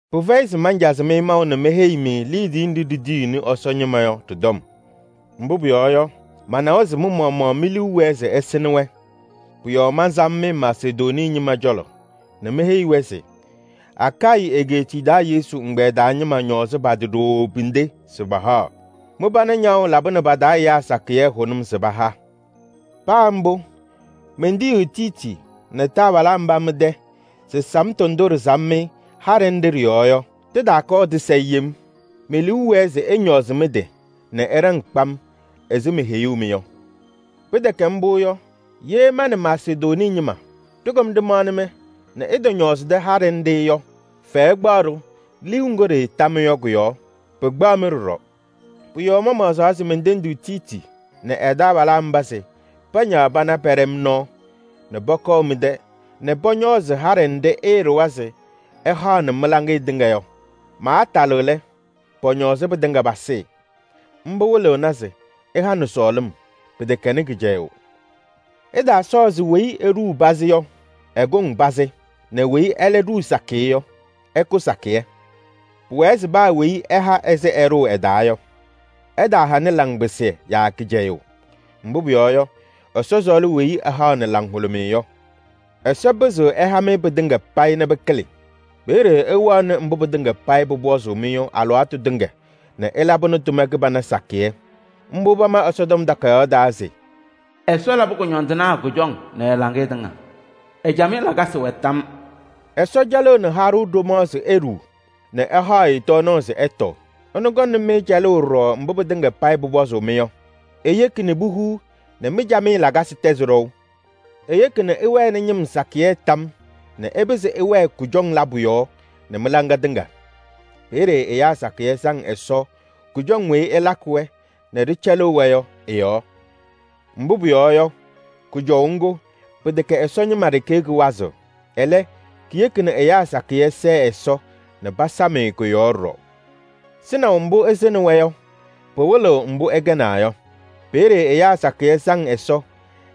Pɩfɛyɩ se mancazɩ-mɩ maʋ nɛ meheyi-mɩ liidiye nɖɩ ɖitiyiɣnɩ Ɛsɔ ñɩma yɔ ɖɩ-tɔm. Mbʋ pʋyɔɔ yɔ, manawa se mɩ-maɣmaɣ mi-liu wɛɛ se ɩsɩŋnɩ-wɛ. Pʋ-yɔɔ mansam-mɩ Masedonii ñɩma cɔlɔ nɛ meheyi-wɛ se: “Akayɩ egeetiye taa Yesu ɛgbɛyɛ taa ñɩma ñɔɔzɩ pa-tɩ ɖooo pinde se pahaɣ. Mɩ-pana ñaɣʋ labɩnɩ pa-taa ɛyaa sakɩyɛ hʋnʋm se paha.” Paa mbʋ, mentiyi Tiiti nɛ taabalaa mba mɩ-tɛ se samtʋ ndʋ ɖɩsam-mɩ haɖɛ nɖɩ ɖɩ-yɔɔ yɔ, tɩtaakɔɔ tɩsayɩ yem. Me-liu wɛɛ se ɩñɔɔzɩ mɩ-tɩ nɛ ɩɖaŋ kpam ɛzɩ meheyuu-mɩ yɔ. Pɩtɛkɛ mbʋ yɔ, ye ma nɛ Masedonii ñɩma ɖɩkɔm ɖɩmaɣnɩ-mɩ nɛ ɩtɔñɔɔzɩdɩ haɖɛ nɖɩ yɔ, fɛyɛ kpaɣ-ɖʋ liu ŋgʋ ɖɩɩta-mɩ yɔ kʋ-yɔɔ. Pɩkpaɣ-mɩ ɖɔɖɔ. Pʋ-yɔɔ mamaɣzaa nɛ mentendi Tiiti nɛ ɛ-taabalaa mba se pañaɣ pana pɛɖɛ-m nɔɔ nɛ pɔkɔɔ mɩ-tɛ nɛ pɔñɔɔzɩ haɖɛ nɖɩ ɩɩɖʋwa se ɩhaɣnɩ mɩ-laŋɩyɛ tɩŋa yɔ. Maatalɩɣ lɛ, pɔñɔɔzɩ pɩtɩŋa pasɩɩ. Mbʋ wɩlɩɣna se ɩhanɩ sɔɔlɩm, pɩtɛkɛnɩ kɩcɛyʋʋ. Ɩtaasɔɔ se weyi eɖuu pazɩ yɔ, ɛkʋŋ pazɩ nɛ weyi ɛlɛ ɖuu sakɩyɛ yɔ, ɛkʋ sakɩyɛ. Pʋwɛɛ se paa weyi ɛha ɛzɩ ɛɖʋʋ ɛ-taa yɔ. Ɛtaahanɩ laŋpɩsɩyɛ yaa kɩcɛyʋʋ. Mbʋ pʋyɔɔ yɔ, Ɛsɔ sɔɔlɩ weyi ɛhaɣnɩ laŋhʋlʋmɩyɛ yɔ. Ɛsɔ pɩzɩɣ ɛha-mɩ pɩtɩŋa payɩ nɛ pɩkɩlɩ. Peeye ɩwɛɣnɩ mbʋ pɩtɩŋa payɩ pʋpɔzʋʋ-mɩ yɔ alɩwaatʋ tɩŋa nɛ ɩlabɩnɩ tʋma kɩbana sakɩyɛ. Mbʋ pama Ɛsɔtɔm Takayaɣ taa se: “Ɛsɔ labɩ kʋñɔndɩnaa kʋjɔŋ nɛ ɛ-laŋɩyɛ tɩŋa. Ɛ-camɩyɛ lakasɩ wɛ tam yɔɔ.” Ɛsɔ cɛlɩɣnɩ haɖʋ ɖomaɣ se eɖuu nɛ ɛhaɣ-ɩ tɔɔnaɣ se ɛtɔɔ. Ɛnʋ kɔŋnɩ-mɩ cɛlʋʋ ɖɔɖɔ mbʋ pɩtɩŋa payɩ pʋpɔzʋʋ-mɩ yɔ. Eyeki nɛ puhuu nɛ mɩ-camɩyɛ lakasɩ tɛzɩ ɖɔʋ. Eyeki nɛ ɩwɛnɩ ñɩm sakɩyɛ tam yɔɔ nɛ ɩpɩzɩ ɩwɛɛ kʋjɔŋ labʋ yɔɔ nɛ mɩ-laŋa tɩŋa. Peeye ɛyaa sakɩyɛ saŋ Ɛsɔ kʋjɔŋ weyi ɩlakɩ-wɛ nɛ ɖɩcɛlɩɣ-wɛ yɔ ɩ-yɔɔ. Mbʋ pʋyɔɔ yɔ, kʋjɔʋ ŋgʋ, pɩtɛkɛ Ɛsɔ ñɩma ɖeke kɩwazɩɣ. Ɛlɛ, kiyeki nɛ ɛyaa sakɩyɛ sɛɛ Ɛsɔ nɛ pasam-ɩ kʋ-yɔɔ ɖɔɖɔ. Sɩnaʋ mbʋ ɩsɩŋnɩ-wɛ yɔ, pɩwɩlɩɣ mbʋ ɩkɛnaa yɔ. Peeye ɛyaa sakɩyɛ saŋ Ɛsɔ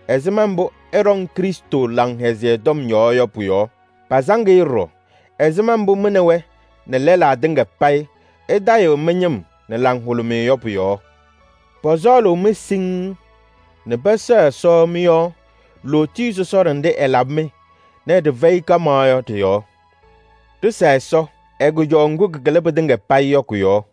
ɛzɩma mbʋ ɩɖɔŋ Krɩstʋ Laŋhɛzɩyɛ Tɔm yɔɔ yɔ pʋ-yɔɔ. Pasaŋ-ɩ ɖɔɖɔ ɛzɩma mbʋ mɩ nɛ wɛ nɛ lɛlaa tɩŋa payɩ ɩtayɩɣ mɩ-ñɩm nɛ laŋhʋlʋmɩyɛ yɔ pʋ-yɔɔ. Pɔsɔɔlʋʋ-mɩ siŋŋ nɛ pɛsɛɣ Ɛsɔ mɩ-yɔɔ lootiye sɔsɔɖɛ nɖɩ ɛlabɩ-mɩ nɛ ɖɩfɛyɩ kaɣmaɣ yɔ ɖɩ-yɔɔ. Ɖɩsa Ɛsɔ ɛ-kʋjɔʋ ŋgʋ kɩkɩlɩ pɩtɩŋa payɩ yɔ kʋ-yɔɔ!